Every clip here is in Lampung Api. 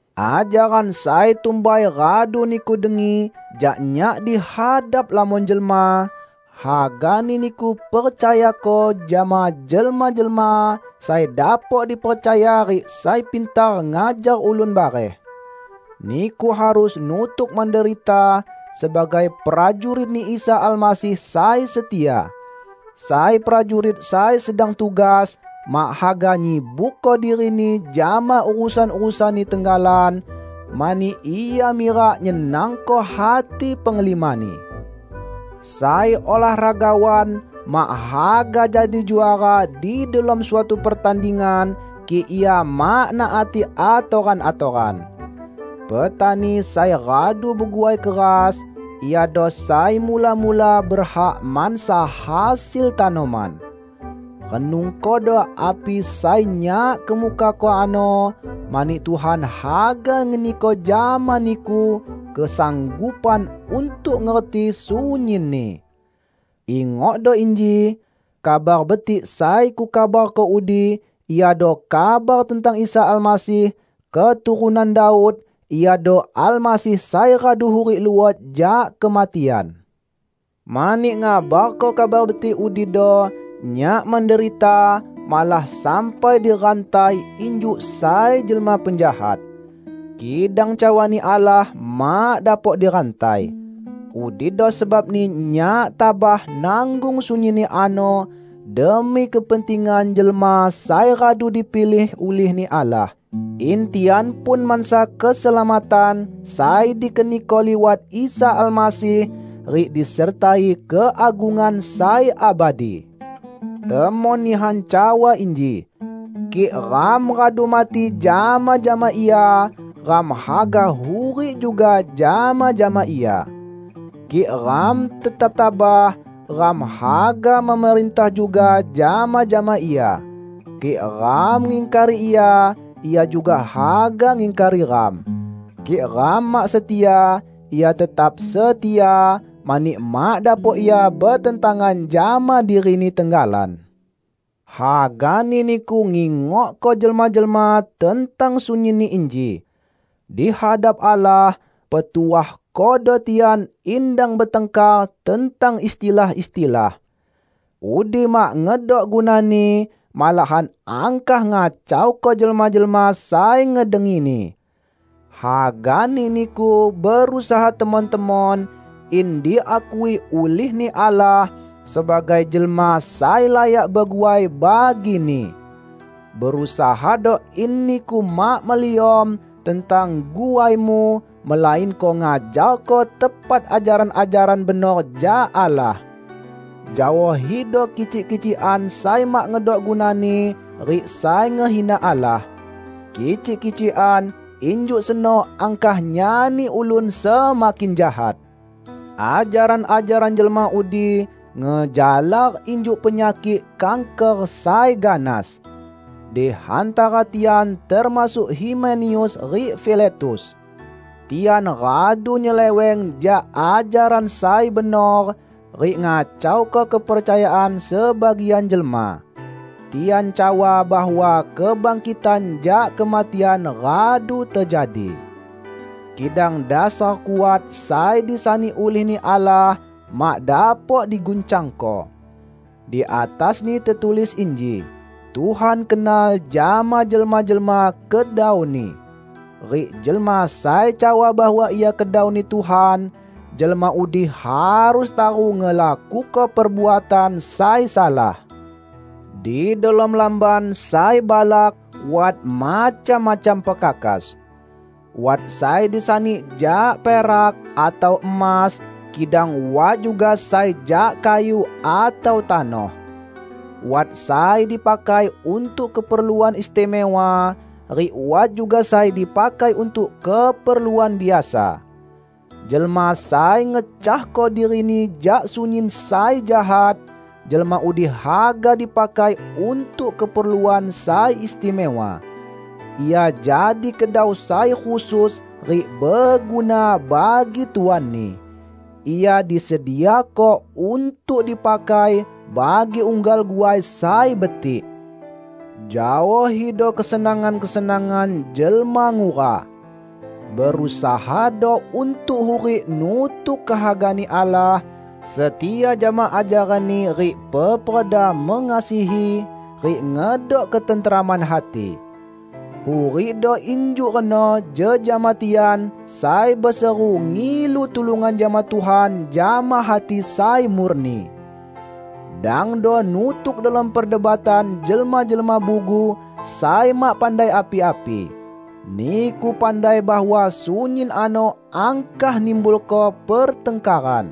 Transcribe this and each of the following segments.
Ajaran sai tumbai radu niku dengi jak nyak di hadap lamon jelma, hagani niku percayako jama jelma-jelma sai dapok dipercaya rik sai pintar ngajar ulun bareh. Niku harus nutuk menderita sebagai prajurit-Ni Isa Almasih sai setia. Sai prajurit sai sedang tugas, mak haga nyibukko dirini jama urusan-urusanni tenggalan, mani ia mirak nyenangko hati penglimani. Sai olahragawan mak haga jadi juara di delom suatu pertandingan kik ia mak naati atoran-atoran. Petani sai radu beguai keras, iado sai mula-mula berhak mansa hasil tanoman. Renungkodo api sai nyak kemukako ano, mani Tuhan haga ngeniko jama niku kesanggupan untuk ngerti sunyinni. Ingokdo inji: Kabar Betik sai kukabarko udi iado kabar tentang Isa Almasih, keturunan Daud; Iado Almasih sai radu hurik luot jak kematian. Mani ngabarko Kabar Betik udido, nyak menderita; malah sampai dirantai injuk sai jelma penjahat. Kidang cawa-Ni Allah mak dapok dirantai. Udido sebabni nyak tabah nanggung sunyinni ano demi kepentingan jelma sai radu dipilih ulih-Ni Allah, in tian pun mansa keselamatan sai dikeniko liwat Isa Almasih, rik disertai keagungan sai abadi. Temon nihan cawa inji, "Kik ram radu mati jama-jama Ia, ram haga hurik juga jama-jama Ia. Kik ram tetap tabah, ram haga memerintah juga jama-jama Ia. Kik ram ngingkari Ia, Ia juga haga ngingkari ram. Kik ram mak setia, Ia tetap setia, mani mak dapok Ia betentangan jama diri-Ni tenggalan." Hagani niku ngingokko jelma-jelma tentang sunyinni inji. Di hadap Allah, petuahkodo tian in dang betangkar tentang istilah-istilah. Udi mak ngedok gunani, malahan angkah ngacauko jelma-jelma sai ngedengini. Hagani niku berusaha temon-temon in diakui ulih-Ni Allah sebagai jelma sai layak beguai bagi-Ni. Berusahado in niku mak meliom tentang guaimu, melainko ngajarko tepat ajaran-ajaran benor jak Allah. Jaohido kicik-kicikan sai mak ngedok gunani rik sai ngehina Allah. Kicik-kicikan injuk seno angkah nyani ulun semakin jahat. Ajaran-ajaran jelma udi ngejalar injuk penyakik kanker sai ganas. Di hantara tian termasuk Himeneus rik Filetus. Tian radu nyeleweng jak ajaran sai benor, rik ngacauko kepercayaan sebagian jelma. Tian cawa bahwa kebangkitan jak kematian radu tejadi. Kidang dasar kuat sai disani ulih-Ni Allah mak dapok diguncangko. Di atasni tetulis inji, "Tuhan kenal jama jelma-jelma kedau-Ni", rik "Jelma sai cawa bahwa ia kedau-Ni Tuhan, jelma udi harus taru ngelakuko perbuatan sai salah". Di delom lamban sai balak wat macam-macam pekakas. Wat sai disani jak perak atau emas, kidang wat juga sai jak kayu atau tanoh. Wat sai dipakai untuk keperluan istimewa, rik wat juga sai dipakai untuk keperluan biasa. Jelma sai ngecahko dirini jak sunyin sai jahat, jelma udi haga dipakai untuk keperluan sai istimewa. Ia jadi kedau sai khusus rik beguna bagi tuanni. Ia disediako untuk dipakai bagi unggal guai sai betik. Jaohido kesenangan-kesenangan jelma ngura. Berusahado untuk hurik nutuk kehaga-Ni Allah, setia jama ajaran-Ni rik peperda mengasihi rik ngedok ketenteraman hati. Hurikdo injuk reno jejama tian sai beseru ngilu tulungan jama Tuhan jama hati sai murni. Dangdo nutuk delom perdebatan jelma-jelma bugu sai mak pandai api-api. Niku pandai bahwa sunyin ano angkah nimbulko pertangkaran.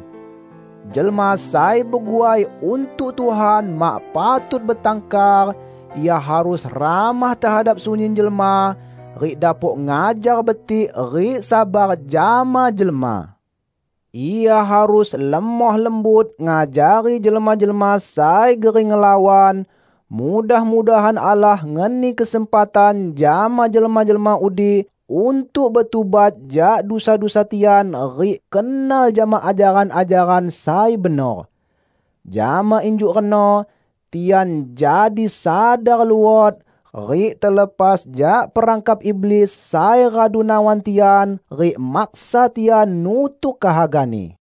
Jelma sai beguai untuk Tuhan mak patut betangkar; ia harus ramah tehadap sunyin jelma, rik dapok ngajar betik rik sabar jama jelma. Ia harus lemoh lembut ngajari jelma-jelma sai gering ngelawan; mudah-mudahan Allah ngeni kesempatan jama jelma-jelma udi untuk betubat jak dusa-dusa tian rik kenal jama ajaran-ajaran sai benor. Jama injuk reno tian jadi sadar luot, rik telepas jak perangkap iblis sai radu nawan tian rik maksa tian nutuk kehagani.